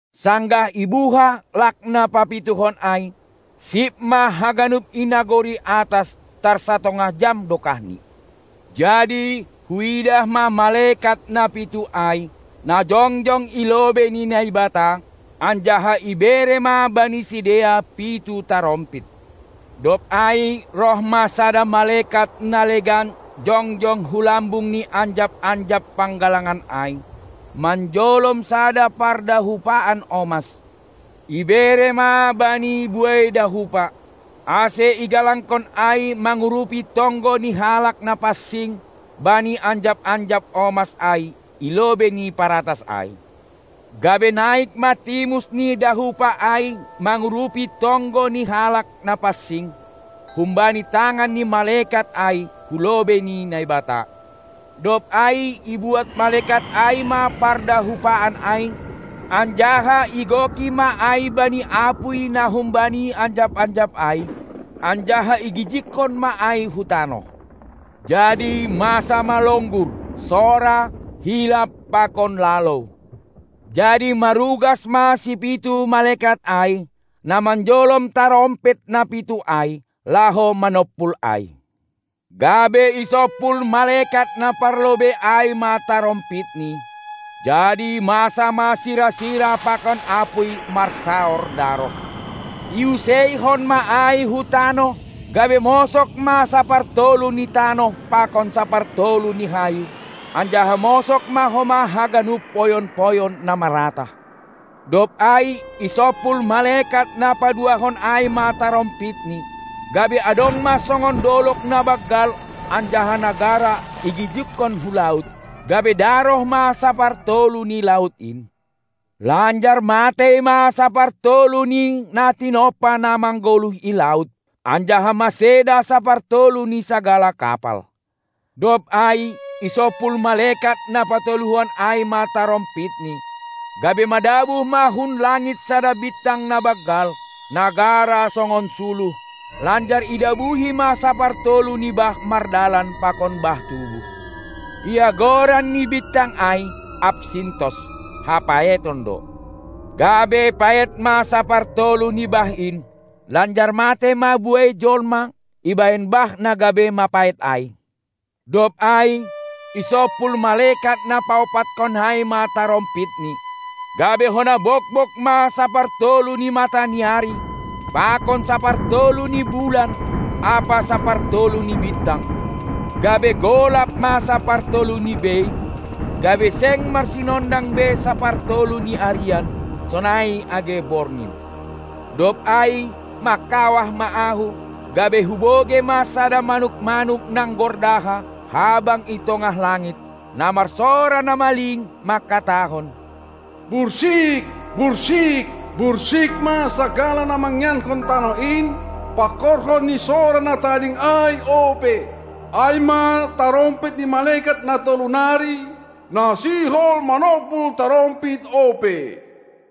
Sanggah ibuha lak na papituhon ai, sip ma haganup i nagori atas tar satongah jam dokahni. Jadi huidah ma malekat na pitu ai, na jongjong i lobei ni Naibata, anjaha ibere ma bani sidea pitu tarompit. Dob ai roh ma sada malekat na legan jongjong hu lambung ni anjap-anjap panggalangan ai, manjolom sada pardahupaan omas. Ibere ma bani buei dahupa, ase igalangkon ai mangurupi tonggo ni halak na pansing bani anjap-anjap omas ai i lobei ni paratas ai. Gabe naik ma timus ni dahupa ai mangurupi tonggo ni halak na pansing, humbani tangan ni malekat ai hu lobei ni Naibata. Dob ai ibuat malekat ai ma pardahupaan ai anjaha igoki ma ai bani apuy na humbani anjap-anjap ai, anjaha igijigkon ma ai hu tanoh; jadi masa ma longgur, sora, hilap pakon lalou. Jadi marugas ma sipitu malekat ai, na manjolom tarompit na pitu ai, laho manompul ai. Gabe isompul malekat na parlobei ai ma tarompitni, jadi masa ma sira-sira pakon apuy marsaor daroh; iuseihon ma ai hu tanoh, gabe mosog ma sapartolu ni tanoh pakon sapartolu ni hayu, anjaha mosog ma homa haganup poyon-poyon na maratah. Dob ai isompul malekat na paduahon ai ma tarompitni, gabe adong ma songon dolog na banggal anjaha na gara igijigkon hu laut; gabe daroh ma sapartolu ni laut in, lanjar matei ma sapartolu ni na tinompa na manggoluh i laut, anjaha maseda sapartolu ni sagala kapal. Dob ai isompul malekat na patoluhon ai ma tarompitni, gabe madabuh ma hun langit sada bintang na banggal, na gara songon suluh, lanjar idabuhi ma sapartolu ni bah mardalan pakon bah tubuh. Ia goran ni bintang ai Apsintos (hapaeton) do; gabe paet ma sapartolu ni bah in, lanjar matei ma buei jolma ibahen bah na gabe mapaet ai. Dob ai isompul malekat na paompathon ai ma tarompitni, gabe hona bogbog ma sapartolu ni mataniari pakon sapartolu ni bulan ampa sapartolu ni bintang, gabe golap ma sapartoluni bei, gabe seng marsinondang be sapartolu ni arian, sonai age borgin. Dob ai mangkawah ma ahu, gabe hubogei ma sada manuk-manuk nanggordaha habang i tongah langit, na marsora na maling mangkatahon: Bursik, bursik, bursik ma sagala na mangianhon tanoh in, pangkorhon ni sora na tading ai ope, ai ma tarompit ni malekat na tolu nari, na sihol manompul tarompit ope.